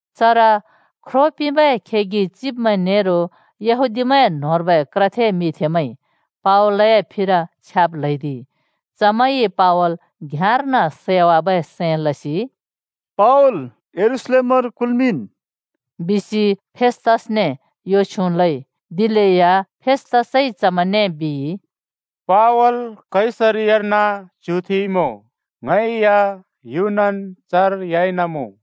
चर ख्रो पिंबै खेगि चिब्मैं नेरो यहूदीमैंए न्होंर्बै क्रथे मिंथेमैंइ पावलए फिर छ्याब् ल्हैदिइ। चमैंइ पावल घ्याँर्न सैवाबै सैं लसि, “पावल यरूशलेमर कुल्‍मिंन्,” बिसि फेस्‍तसने यो छ्युँ लइ। दिलेया फेस्‍तसइ चमैंने बिइ, “पावल कैसरियार्न च्‍युथेंइँमुँ, ङै या युनन् चर ह्‍याइन मुँ।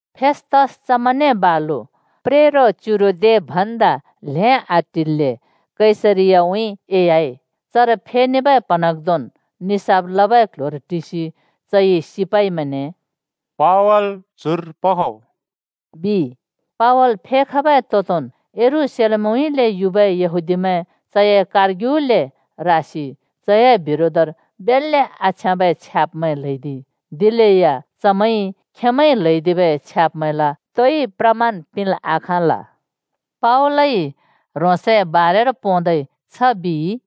फेस्तस चमैंने बालु प्रेरो च्युरो दे भन्दा ल्हें आटिल्‍ले कैसरियाउँइँ एह्‍याइ। चर फेनेबै प्हँन्हाँग्धोंन् निसाफ लबै क्ल्ह्‍योर टिसि चइ सिपाइमैंने “पावल चुर पखो!” बिइ। पावल फेखबै तोंदोंन् यरूशलेमउँइँले युबै यहूदीमैं चए कारग्युले रासि चए बिरोधर बेल्‍ले आछ्याँबै छ्याब्मैं ल्हैदिइ। दिलेया चमैंइ खेंमैंइ ल्हैदिबै छ्याब्मैंला तोइ प्रमाण पिंल् आखाँल। पावलइ ह्रोंसए बारेर पोंदै छ बिइ,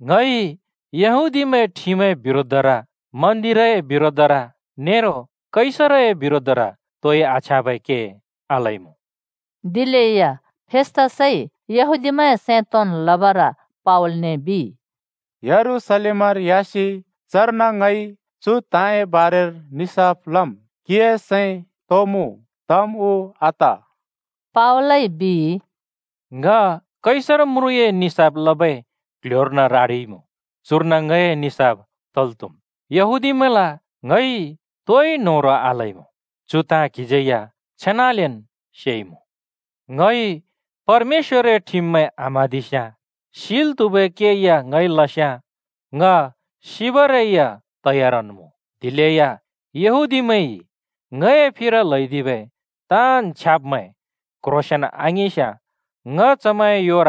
“ङइ यहूदीमैंए ठिमए बिरोधर, मन्दिरए बिरोधर नेरो कैसरए बिरोधर तोइ आछ्याँबै के आलइमुँ।” दिलेया फेस्‍तसइ यहूदीमैं सैं तोंन् लबर पावलने बिइ, “यरूशलेमर ह्‍यासि चर्न ङइ चु ताँए बारेर निसाफ लम् क्हिए सैं तो मुँ? तम् उ आत?” पावलइ बिइ, “ङ कैसर म्रुँए निसाफ लबै क्‍ल्‍ह्‍योर्न रारिइमुँ, चुर्न ङए निसाफ तल् त्‍हुम्। यहूदीमैंला ङइ तोइ न्होह्रों आलइमुँ। चु ताँ क्हिज्यै या छेनालेन् सेइमुँ। ङइ परमेश्‍वरए ठिममैं आम्‍हाँदिस्‍याँ, सिल् त्हुबै के या ङइ लस्‍याँ, ङ सिबरै या तयारन् मुँ। दिलेया यहूदीमैंइ ङए फिर ल्‍हैदिबै ताँन् छ्याब्मैं क्‍ह्रोंसेंन् आङिंस्‍याँ ङ चमैंए योर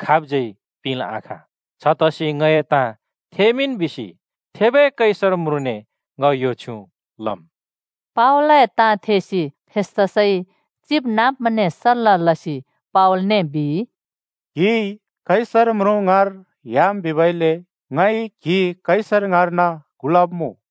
खाबज्‍यै पिंल् आखाँ। छतसि ङए ताँ थेमिंन् बिसि थेबै कैसर म्रुँनेन् ङ यो छ्युँ लम्।” पावलए ताँ थेसि फेस्तसइ चिबनाँब्मैंने सल्‍ला लसि पावलने बिइ, “क्हिइ कैसर म्रुँ ङाँर ह्‍याम् बिबइले ङइ क्हि कैसर ङाँर्न कुलब्मुँ।”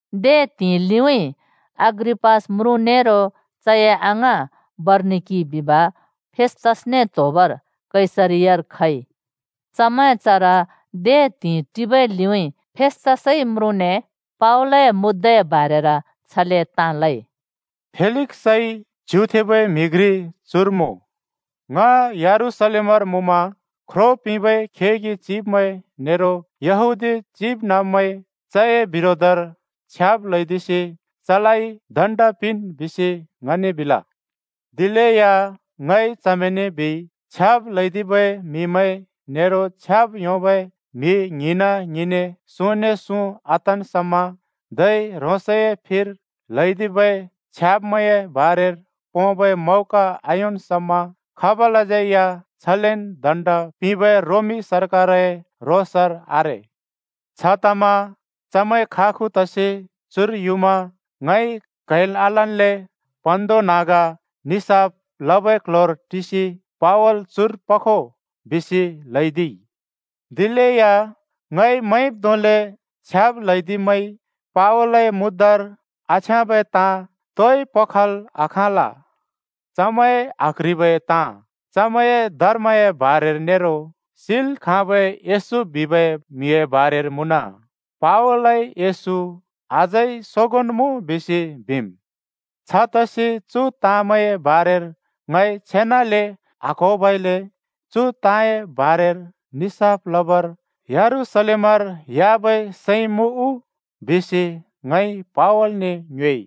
दे त्हिंइ लिउँइँ अग्रिपास म्रुँ नेरो चए अङाँ बरनिकि बिब फेस्तसने त्होबर कैसरियार खइ। चमैं चर दे त्हिंइ टिबै लिउँइँ फेस्तसइ म्रुँने पावलए मुद्दाए बारेर छले ताँ लइ: “फेलिक्सइ च्युथेंबै म्हि घ्रि चुर मुँ। ङ यरूशलेमर मुँमा, ख्रो पिंबै खेगि चिब्मैं नेरो यहूदी चिबनाँब्मैंइ चए बिरोधर छ्याब् ल्हैदिसि चलाइ दण्ड पिंन् बिसि ङने बिल। दिलेया ङइ चमैंने बिइ, ‘छ्याब् ल्हैदिबै म्हिमैं नेरो छ्याब् योंबै म्हि ङ्हिंना-ङ्हिंन्‍ने सुँने सुँ आतन् समा, धै ह्रोंसए फिर ल्हैदिबै छ्याब्मैंए बारेर पोंबै मौका आयोंन् समा, खाबलाज्यै या छलेन् दण्ड पिंब रोमी सरकारए रोसर आरे।’ “छतमा चमैं खागु तसि चुर युमा ङइ क्हैल् आलन्ले प्हँन्हाँग्धोंन् निसाफ लबै क्‍ल्‍ह्‍योर टिसि, ‘पावल चुर पखो,’ बिसि ल्हैदिइ। दिलेया ङइ मैंब् धोंले छ्याब् ल्हैदिब्मैंइ पावलए मुद्दार आछ्याँबै ताँ तोइ पखल् आखाँल। चमैंए आक्ह्रिबै ताँ चमैंए धर्मए बारेर नेरो सिल् खाँबै येशू बिबै म्हिए बारेर मुँन। पावलइ येशू अझै सोंगोंन् मुँ बिसि बिमना। छतसि चु ताँमैंए बारेर ङइ छेनाले आक्होबइले चु ताँए बारेर ‘निसाफ लबर यरूशलेमर ह्‍याबै सैं मुँ उ?’ बिसि ङइ पावलने ङ्योएइ।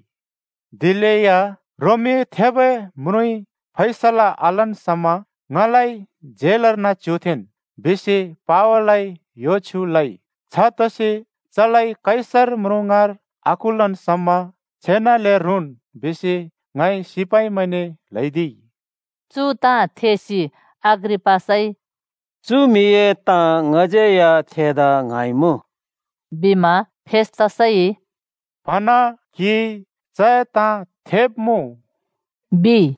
दिलेया ‘रोमी थेबै म्रुँइ फैसला आलन् समा ङलाइ झेलर्न च्युथेंन्,’ बिसि पावलइ यो छ्युँ लइ। छतसि चलाइ कैसर म्रुँ ङाँर आकुलन् समा छेनाले रुँन् बिसि ङइ सिपाइमैंने ल्हैदिइ।” चु ताँ थेसि अग्रिपासइ “चु म्हिए ताँ ङज्यै या थेदा ङ्हाँइमुँ,” बिमा फेस्‍तसइ “प्हँन क्हिइ चए ताँ थेब्मुँ,” बिइ।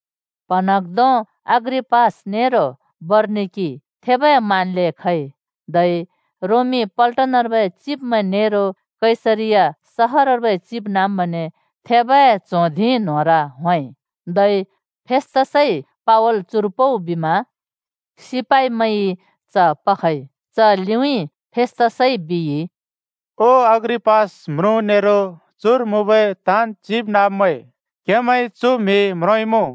प्हँन्हाँग्धों अग्रिपास नेरो बरनिकि थेबै मानले खइ। धै रोमी पल्टनर्बै चिब्मैं नेरो कैसरिया सहरर्बै चिबनाँब्मैंने थेबै च्हों धिं न्होंर होंइ। धै फेस्‍तसइ “पावल चुर पउ!” ल्हैदिमा सिपाइमैंइ च पखइ। च लिउँइँ फेस्‍तसइ बिइ, “ओ अग्रिपास म्रुँ नेरो चुर मुँबै ताँन् चिबनाँब्मैं! क्‍हेमैंइ चु म्हि म्रोंइँमुँ।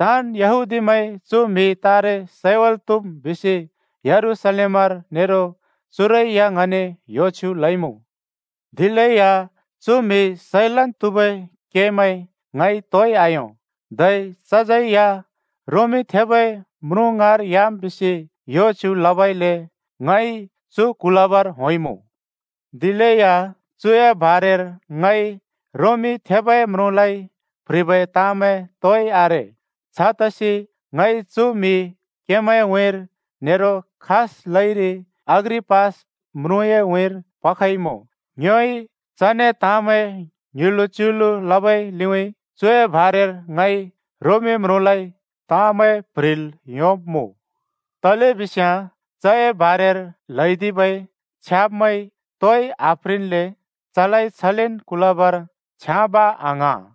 ताँन् यहूदीमैंइ चु म्हि तारे सैवाल् त्हुम् बिसि यरूशलेमर नेरो चुरै या ङने यो छ्युँ लइमुँ। दिलेया चु म्हि सैलन् त्हुबै केमैं ङइ तोइ आयों। धै चज्यै या रोमी थेबै म्रुँ ङाँर ह्‍याम् बिसि यो छ्युँ लबइले ङइ चु कुलबर होंइँमुँ। दिलेया चुए बारेर ङइ रोमी थेबै म्रुँलाइ प्ह्रिबै ताँमैं तोइ आरे। छतसि ङइ चु म्हि क्हेमैंए उँइँर नेरो खास लइरि अग्रिपास म्रुँए उँइँर पखइमुँ। ङ्योइ चने ताँमैं ङ्युँलु-च्युलु लबै लिउँइँ चुए बारेर ङइ रोमी म्रुँलाइ ताँमैं प्ह्रिल् योंब्मुँ। तलेबिस्याँ चए बारेर ल्हैदिबै छ्याब्‌मैं तोइ आप्ह्रिल्‍ले चलाइ छलेन् कुलबर छ्याँब आङ्हाँ।”